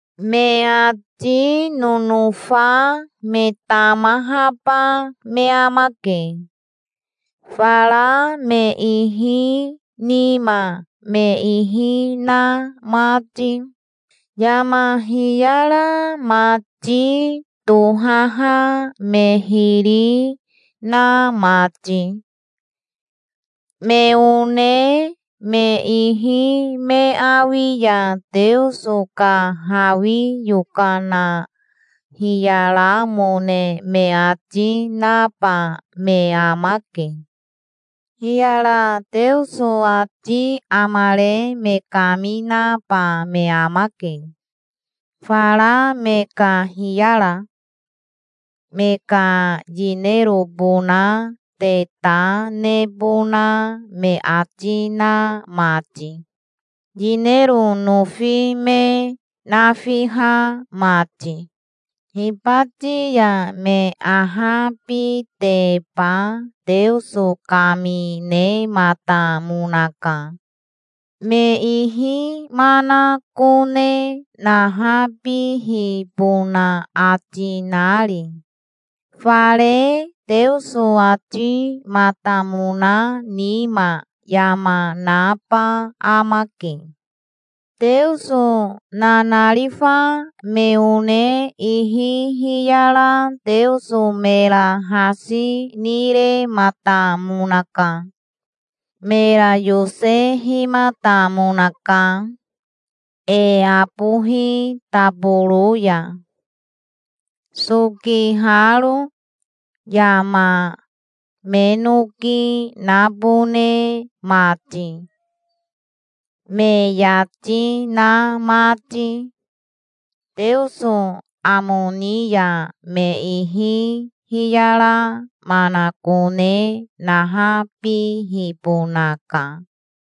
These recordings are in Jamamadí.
Me ati nonofa me tamahaba me amake, fara me ihi nima me ihi na mati, yama hiyara mati tohaha me hiri na mati. Me one me ihi me awi ya Teoso ka hawi yokana hiyaramone me ati naba me amake. Hiyara Teoso ati amare me kaminaba me amake, fara me ka hiyara, me ka yinerobona te ta nebona me ati na mati, yinero nofi me nafiha mati. Hibati ya me ahabiteba Teoso kaminematamonaka, me ihi manakone nahabihibona ati nari. Fare Teoso atimatamona nima yama naba amake. Teoso nanarifa me one ihi hiyara Teoso mera hasi nirematamonaka. Mera yosehimatamonaka, e abohi taboro ya, sokiharo, yama me noki nabone mati, me yati na mati. Teoso amo ni ya me ihi hiyara manakone nahabihibonaka.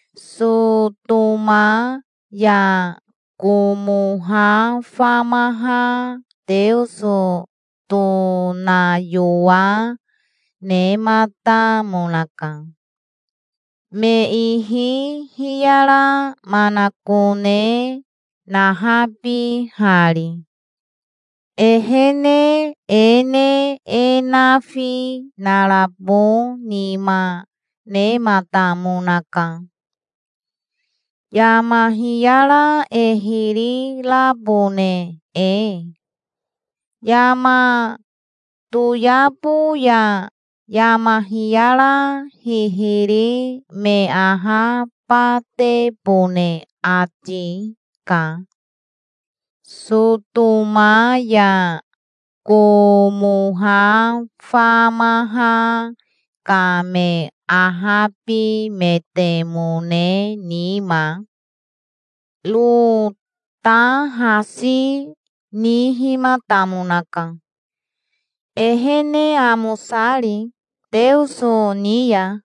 Sotoma ya Komoha famaha Teoso tonayowa nematamonaka, me ihi hiyara manakone nahabihari. Ehene e ne e nafi narabo nima nematamonaka, yama hiyara e hiri rabone e. Yama toyabo ya yama hiyara hihiri me ahabatebone ati ka Sotoma ya Komoha famaha ka me ahabimetemone nima. Ro ta hasi nihimatamonaka, ehene amosari Teoso ni ya.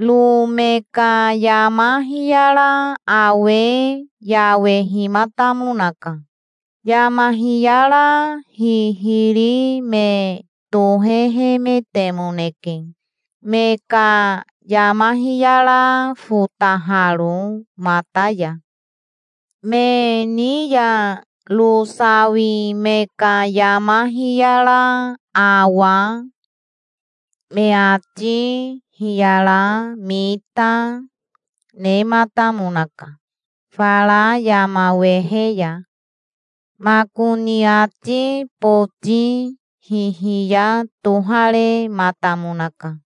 Ro me ka yama hiyara awe yawehimatamonaka. Yama hiyara hihiri me tohehemetemoneke, me ka yama hiyara fotaharo mata ya. Me ni ya Ro sawi me ka yama hiyara awa, me ati hiyara mita, nematamonaka fara yama wehe ya. Makoni ati boti hihiya toharematamonaka,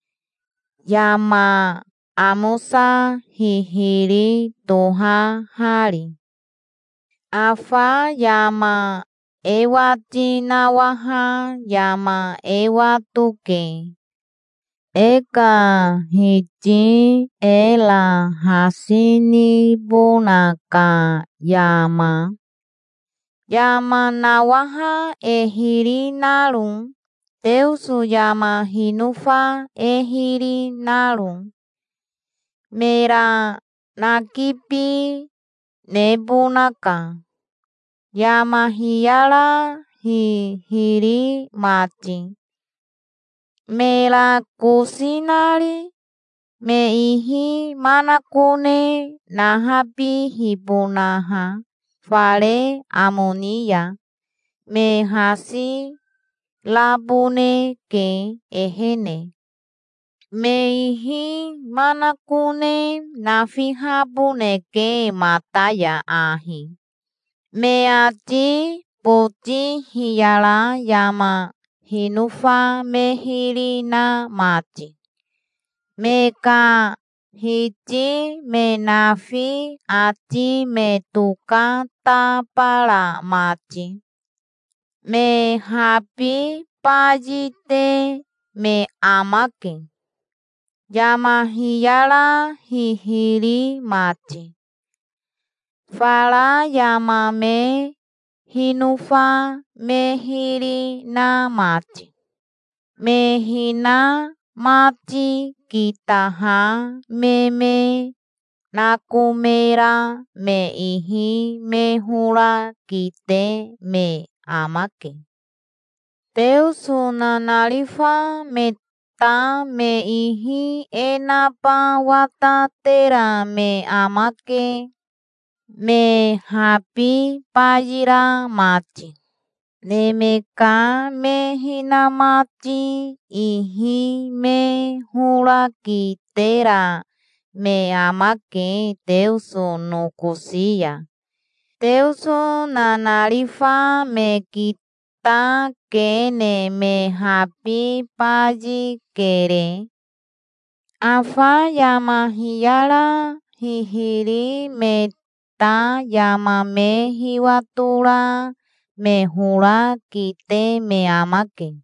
yama amosa hihiri tohahari. Afa yama e wati nawaha yama e watoke, e ka Hiti era hasi nibona ka yama, yama nawaha e hiri naro, Teoso yama hinofa e hiri naro. Mera nakibi nebonaka, yama hiyara hihiri mati, mera kosi nari, me ihi manakone nahabihibonaha fare amo ni ya. Me hasi raboneke ehene. Me ihi manakone nafihaboneke mata ya ahi, me ati boti hiyara yama hinofa me hiri na mati, me ka hiti me nafi ati me tokatabara mati. Me habi bayite me amake, yama hiyara hihiri mati, fara yama me hinofa me hiri na mati. Me hinamati kitaha me me nakomera me ihi me hora kite me amake. Teoso nanarifa me ta me ihi e naba watatera me amake, me habi bayira mati. Neme ka me hinamati ihi me hora kitera me amake Teoso nokosi ya. Teoso nanarifa me kitakene me habi bayikere. Afa yama hiyara hihiri me ta yama me hiwatora me hora kite me amake.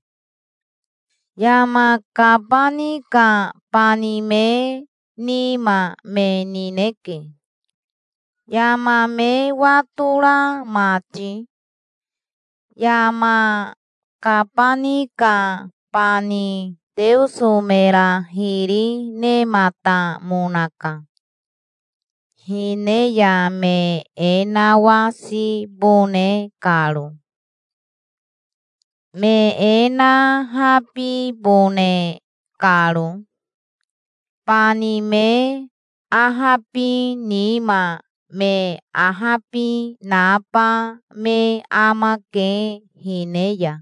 Yama kabani ka bani me nima me nineke, yama me watora mati. Yama kabani ka bani Teoso mera hiri nematamonaka, hine ya me e nawasibone karo, me e nahabibone karo. Bani me ahabi nima me ahabi naba me amake hine ya.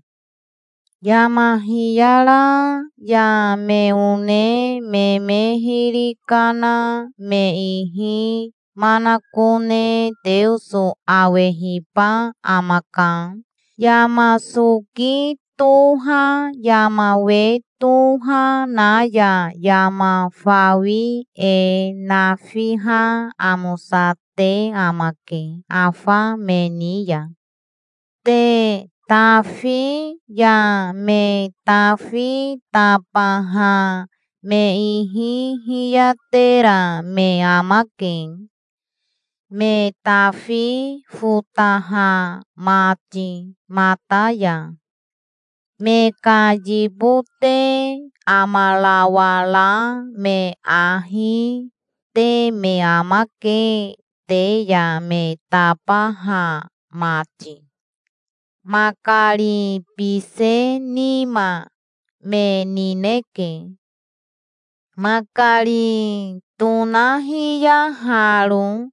Yama hiyara ya me one me me hiri kana me ihi manakone Teoso awehiba amaka. Yama soki toha yama we toha na ya yama fawi e nafiha amosate amake afa me ni ya. Te tafi ya me tafi tabaha me ihi hiyatera me amake, me tafi fotaha mati mata ya. Me ka yibote amarawara me ahi, te me amake te ya me tabaha mati. Makari bise nima me nineke, makari tonahiyaharo.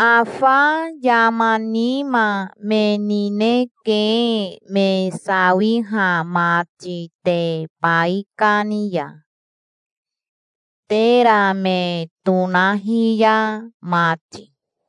Afa yama nima me nineke me sawiha mati te baikani ya, tera me tonahiya mati.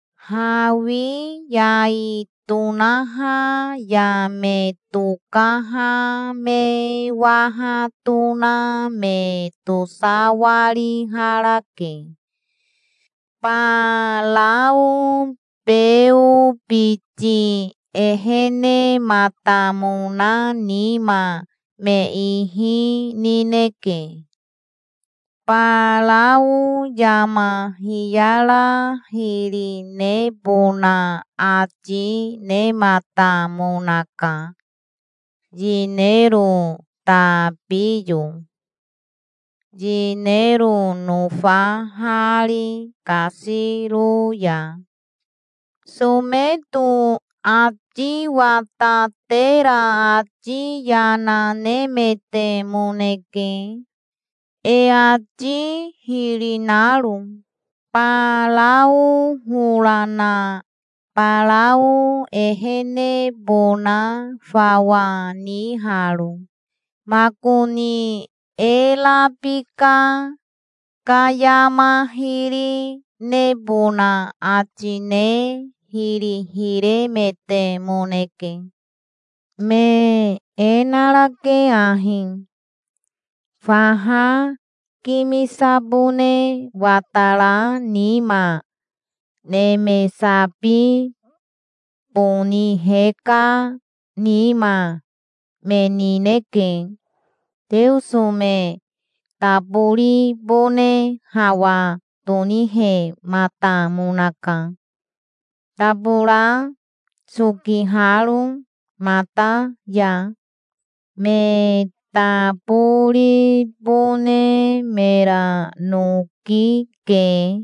Hawi yai tonaha ya me tokaha me waha tona me tosawariharake. Barao Beo biti ehenematamona nima me ihi nineke. Barao yama hiyara hiri nebona ati nematamonaka, yinero tabiyo, yinero nofahari kasiro ya. Someto ati watatera ati yana nemetemoneke, e ati hiri naro, Barao hora na Barao ehenebona fawa niharo. Makoni e rabika ka yama hiri nebona ati ne hiri hiremetemoneke. Me e narake ahi, faha kimisabone watara nima. Neme sabi boni heka nima me nineke. Teoso me taboribone hawa tonihematamonaka, tabora sokiharo mata ya. Me taboribone mera noki ke.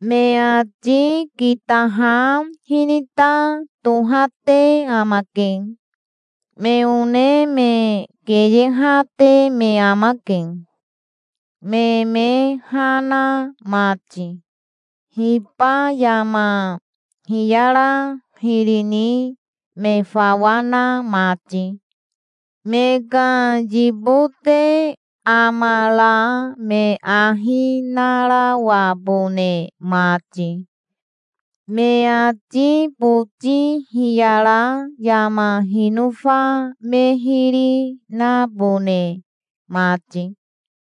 Me ati kitaha hinita tohate amake. Me one me keyehate me amake, me me ha na mati, hiba yama hiyara hiri ni me fawa na mati, me ka yibote amara me ahi narawabone mati, me ati boti hiyara yama hinofa me hiri nabone mati.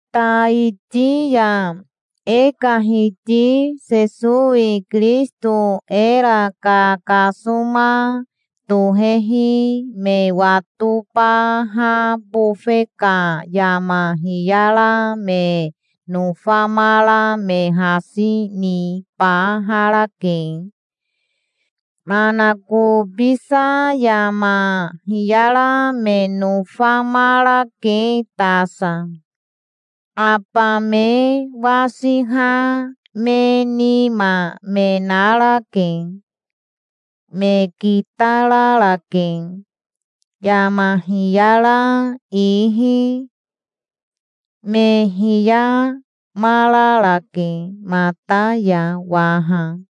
Taiti ya e ka Hiti Sesowi Kirisito era kakasoma tohehi me watobaha bofe ka yama hiyara me nofamara me hasi nibaharake. Manakobisa yama hiyara me nofamarake tasa. Aba me wasiha me nima me narake. Me kitararake, yama hiyara ihi. Me hiyamararake mata ya waha.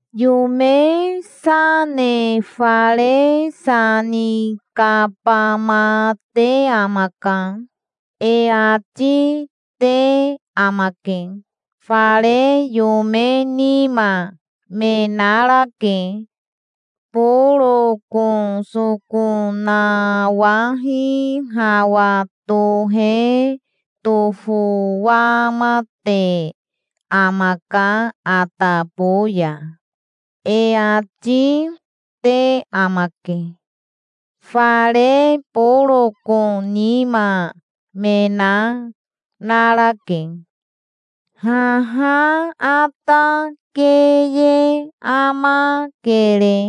"Yome sa ne fare sa ni kabamate amaka", e ati te amake. Fare yome nima me narake. "Boroko soko nawahi hawa tohe tofowamate amaka atabo ya", e ati, te amake. Fare boroko nima me na narake. Haha ata keye amakere.